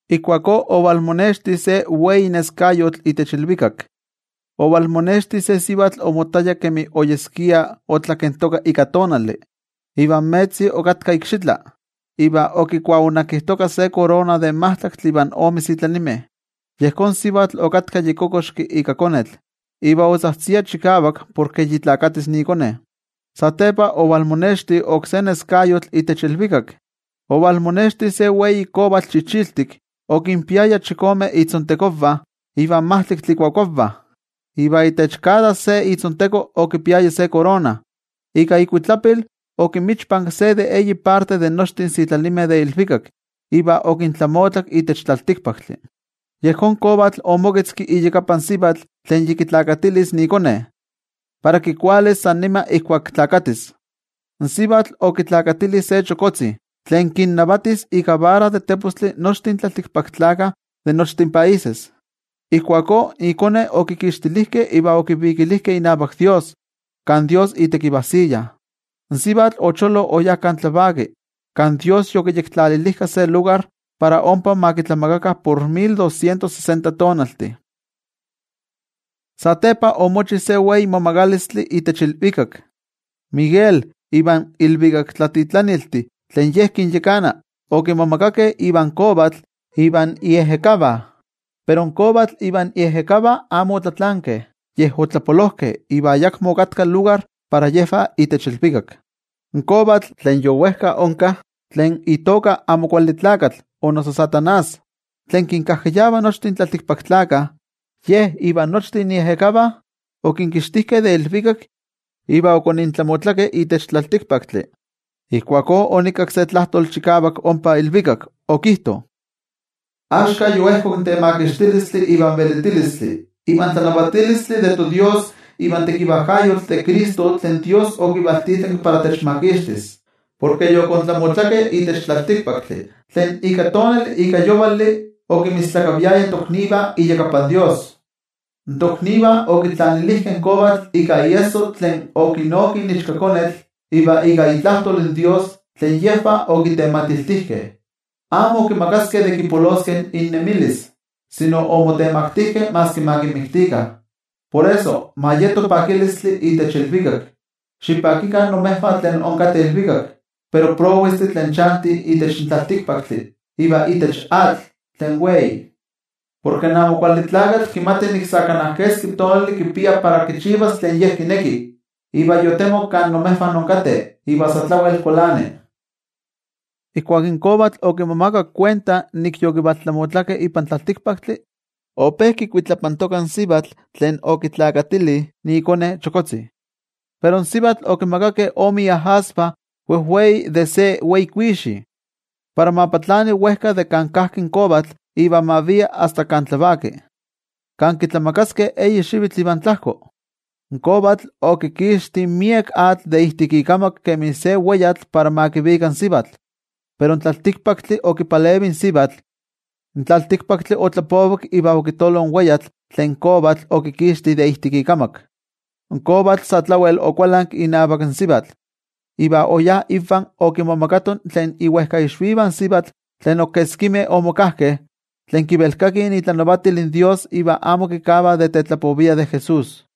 Ijkuakó ovalmonexti se wei neskayotl itech ilvikak. Ovalmonexti se sivatl omottaya kemi oyeskia otlakentoka ika tonali, iva in metzi okatka ikxitla, iva okikuaonakijtoka se korona de majtlaktli ivan ome sitlalimeh. Yejón sivatl okatka yi kokoxki ika konetl, iva otzajtzia chikavak porke yi nesis ikone. Satepa ovalmonexti oksé neskayotl itech ilvikak. Ovalmonexti se wei kovatl chichiltik, okinpiaya chikome itzontekonvah, iva majtlaktli ikuakuavah, iva itech kada se itzonteko okipiaya se korona. Ika ikuitlapil okinmichpanki se de eyi parte de nochtin in sitlalimeh de ilvikak iva okintlamotlak itech tlaltikpaktli. Yejón kovatl omoketzki iyakapan sivatl tlen yi nesis ikone, para kikualis san nima ijkuak nesis. In sivatl okipixki se chokotzi, tlen kinnavatis ika ivara de tepostli nochtin tlaltikpaktlakah de nochtin países. Ijkuakó ikone okikixtilijkeh iva okivikilijkeh inavak toYejwatzi, kan toYejwatzi itekivajsiya. In sivatl ocholo oyá kan tlavaki, kan toYejwatzi yokiyektlalilijka se lugar para ompa ma kitlamakakah por mil doscientos sesenta tonaltih. Satepa omochi se wei momagalistli itech ilvikak. Miguel ivan ilvikaktlatitlaniltih tlen ye kinyakana okimomagakeh ivan kovatl ivan iejekavah. Pero in kovatl ivan iejekavah amo otlatlankeh yej otlapolojkeh iva ayakmo okatka lugar para yejvah itech ilvikak. In kovatl, tlen yowejka onka, tlen noijki itoka Amo Kuali Tlakatl o noso Satanás tlen kinkajkayava nochtin tlaltikpaktlakah, ye ivan nochtin iejekavah okinkixtijkeh de ilvikak iva okonintlamotlakeh itech tlaltikpaktli. Ijkuakó onikakki se tlajtoli chikavak ompa ilvikak, okijto: —Axka yoejkok in temakixtilistli, ivan velitilistli, ivan tlanavatilistli de toDios ivan tekivajkayotl de Cristo tlen Dios okivaltitlanki para techmakixtis, porke yokontlamotlakeh itech tlaltikpaktli tlen ika tonali ika yovali okinmistlakaviaya toknivah iyakapan Dios. In toknivah okitlanilijkeh in kovatl ika iesso tlen okinoki in Ichkakonetl iva ika itlajtol in Dios tlen yejvah okitematiltijkeh, amo okimakaskeh de kipoloskeh innemilis, sino omotemaktijkeh maski ma kinmiktikah. Por eso, ma yeto pakilistli itech ilvikak. Xipakikah imejvah tlen inkateh ilvikak. Pero, prowestih tlen chantih itech tlaltikpaktli iva itech atl tlen wei. Porke in Amo Kuali Tlakatl kimati nik sa kana keski tonali kipia para kichivas tlen ye kineki iva yotemok kan imejvah inkateh iva sa tlawel kualani. Ijkuak in kovatl okimomakak kuenta nik yokivaltlamotlakeh ipan tlaltikpaktli, ope kikuitlapantoka in sivatl tlen okipixki ikone chokotzi. Pero in sivatl okimakakeh ome iajasvah wejwei de se wei kuixi, para ma patlani wejka de kan kajki in kovatl iva ma via asta kan tlavaki, kan kitlamakaskeh eyi xivitl ivan tlajko. In kovatl okikixti miek atl de ijtik ikamak kemi se weyatl para ma kivika in sivatl. Pero in tlaltikpaktli okipalevi in sivatl. In tlaltikpaktli otlapovik iva okitolo in weyatl tlen in kovatl okikixti de ijtik ikamak. In kovatl sa tlawel okualanki inavak in sivatl, iva oyá invah okimomagato tlen iwejkaixvivah in sivatl tlen ok keskimeh omokajkeh, tlen kivelkakih itlanavatilvah in toYejwatzi, iva amo kavah de tetlapoviah de Jesús.